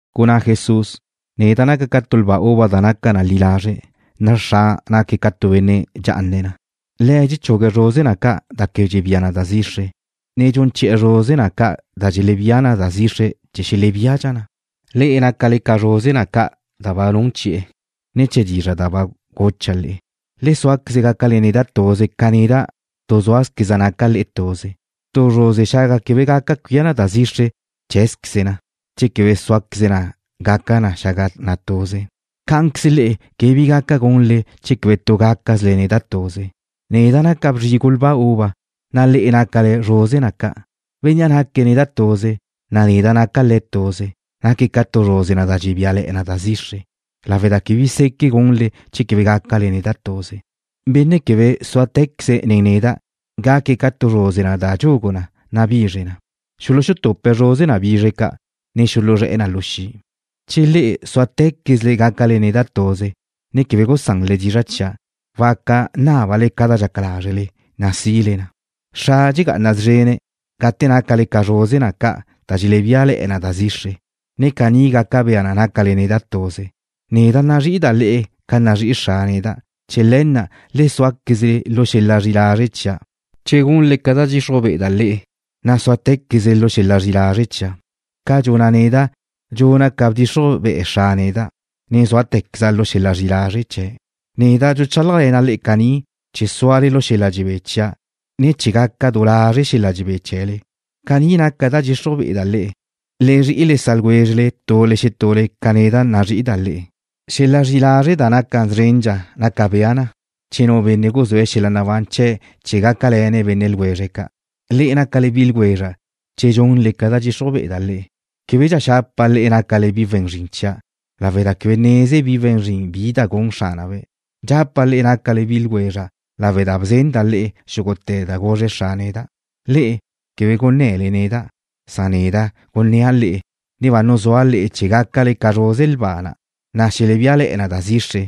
Gunná Jesús: ―Neda' naca' ca tu lba uva da naca na li lazre', na' Xra' naque̱' ca tu benne' dxá'ane̱' na. Le̱' dxechugue̱' zruze na ca' da quebe dxelebía na da zixre, ne dxun chi'e̱ zruze na ca' da dxelebía na da zixre chee̱ xelebíadxa na. Le'e nácale ca zruze na ca' da ba nun chi'e̱, ne̱ chee̱ dizra' da ba gucha' le'e. Le súaqueze gácale neda' tuze ca neda' tu zúale̱zqueza' le'e. Tu zruze xaga quebe gaca cuía na da zixre cheé̱zqueze na che quebe súale̱queze na xaga na'. Cá'anqueze le'e quebe bi gaca gunle che quebe tu gácazquezle neda' tuze. ’Neda' naca' bzrigu lba uva, na' le'e nácale zruze na ca'. Bénnea' naque̱' neda' tuze, na' neda' naca' le̱' tuze, naque̱' ca tu zruze na da dxebíale̱'e̱ na da zixre, lawe' da quebe bi seque' gunle che quebe gácale neda' tuze. Benne' quebe súate̱queze̱' nen neda' gaque̱' ca tu zruze na da dxugu na, na' bizre na. Xuluxutupe̱' zruze na bizre ca', ne xuluzré̱'e̱ na lu xi'. ’Che le'e súate̱quezle neda' tuze, ne quebe gusanle dizra' chia', waca nábale ca da dxaca lázrele, na' sile na. Xra' dxegá'ana szrene̱' gate nácale ca zruze na ca' da dxelebíale̱'e̱ na da zixre, ne caní gaca bea na nácale neda' tuze. Neda' nazrí'ida' le'e ca nazrí'i Xra' neda'. Chee̱ le̱ na' le súaquezle lu xel-la' zri'i lazre' chia'. Che gunle ca da dxixruj be'eda' le'e, na' súate̱quezle lu xel-la' zri'i lazre' chia', ca dxuna' neda', dxuna' ca bdxixruj be'e Xra' neda', ne zúate̱queza' lu xel-la' zri'i lazre' chee̱'. ’Neda' dxuchálajle̱na' le'e caní chee̱ súale lu xel-la' dxebé chia', ne chee̱ gaca du lazre' xel-la' dxebé chee̱le. Cani naca da dxixruj be'eda' le'e: Le zri'i le sa' ljwézrele tule xetule ca neda' nazrí'ida' le'e. Xel-la' zri'i lazre' da naca szrendxa naca bea na che tu benne' guzúe̱' xel-la' nabán chee̱' chee̱ gácale̱ne̱' bi ljwezre̱' ca'. Le'e nácale bi ljwezra' che dxunle ca da dxixruj be'eda' le'e. Québedxa xapa' le'e nácale bi we̱n zrin chia' lawe' da quebe neze bi we̱n zrin bi da gun xránabe'. Dxapa' le'e nácale bi ljwezra' lawe' da ba bzenda' le'e xúgute̱ da guzre Xra' neda'. Le'e quebe gunné̱le neda'. Neda' gunnéa' le'e, ne ba nuzúa' le'e chee̱ gácale ca zruze lba na' da dxelebíale̱'e̱ na da zixre,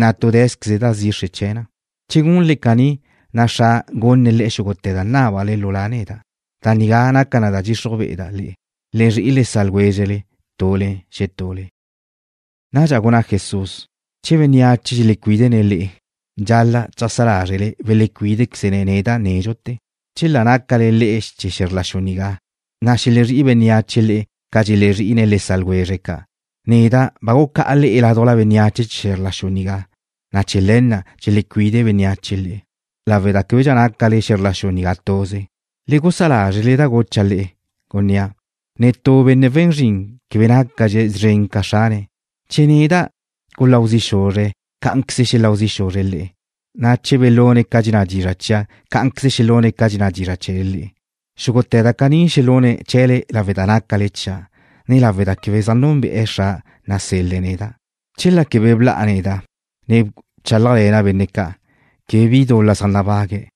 na' tu súazqueze da zixre na'. Che gunle caní, na' Xra' gunne̱' le'e xúgute̱ da nábale lu La' neda'. Da nigá naca na da dxixruj be'eda' le'e: Le zri'i le sa' ljwézrele tule xetule. Nadxa gunná Jesús: ―Che bénneache dxelecuídene̱' le'e, dxal-la' cheajsá lázrele belecuídequeze̱' neda' nédxute̱. Chela nácale le'e chee̱ xe̱zr la xu nigá, na' xelezrí'i bénneache le'e ca zaj nazrí'ine̱' le sa' ljwezre̱' ca'. Neda' ba gucá'a le'e ládujla bénneache chee̱ xe̱zr la xu nigá, na' chee̱ le̱ na' dxelecuide bénneache le'e lawe' da québedxa nácale xe̱zr la xu nigá tuze. Le gusá lázrele da gucha' le'e, gunnéa': Netú benne' we̱n zrin quebe nácadxe̱' szren ca xrane̱'. Che guláu zi' xuzre̱' neda', cá'anqueze xelau zi' xuzre̱' le'e, na' che belune̱' ca dxenná dizra' chia', cá'anqueze xelune̱' ca dxenná dizra' chee̱le le'e. Xúgute̱ da caní xelune̱' chee̱le lawe' da nácale chia', ne lawe' da quebe zaj núnbe'e̱ Xra' nasel-le̱' neda'. ’Chela quebe bla'a neda', ne bchálajle̱na' benne' ca', quebe bi dul-la zaj nabague̱'.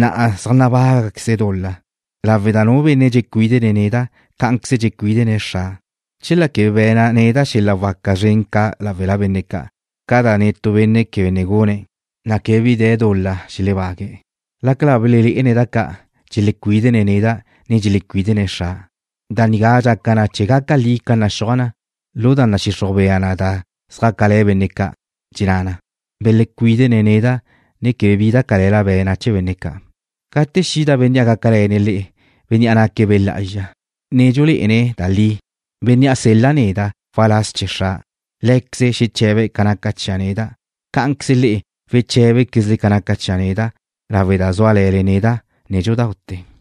Na'a zaj nabágaqueze̱' dul-la lawe' da nu benne' dxecuídene̱' neda', cá'anqueze dxecuídene̱' Xra'. Chela quebe be̱na' neda' xel-la' waca zren ca' láwela benne' ca' ca da netú benne' quebe ne gune̱', na' quebe bi dul-la xelebágue̱'. Lácala ba belelé'ene̱' da ca', dxelecuídene̱' neda', ne dxelecuídene̱' Xra'. Da nigá dxaca na chee̱ gaca li ca naxúaj na lu da nadxixruj bea na da zjácale̱ benne' ca'. Dxenná na: Belecuídene̱' neda' ne quebe bi da cale̱la be̱na' chee̱ benne' ca'. ’Gate xida Bénnea' gácale̱ne̱' le'e, Bénnea' naque̱' Be' Lá'azxa, ne dxulé'ene̱' da li, Bénnea' sel-la' neda' waláz chee̱ Xra', Lé̱queze̱' xeche̱be̱' ca naca chia' neda'. Cá'anqueze le'e weché̱bequezle ca naca chia' neda' lawe' da zúale̱le neda' nédxudaute̱.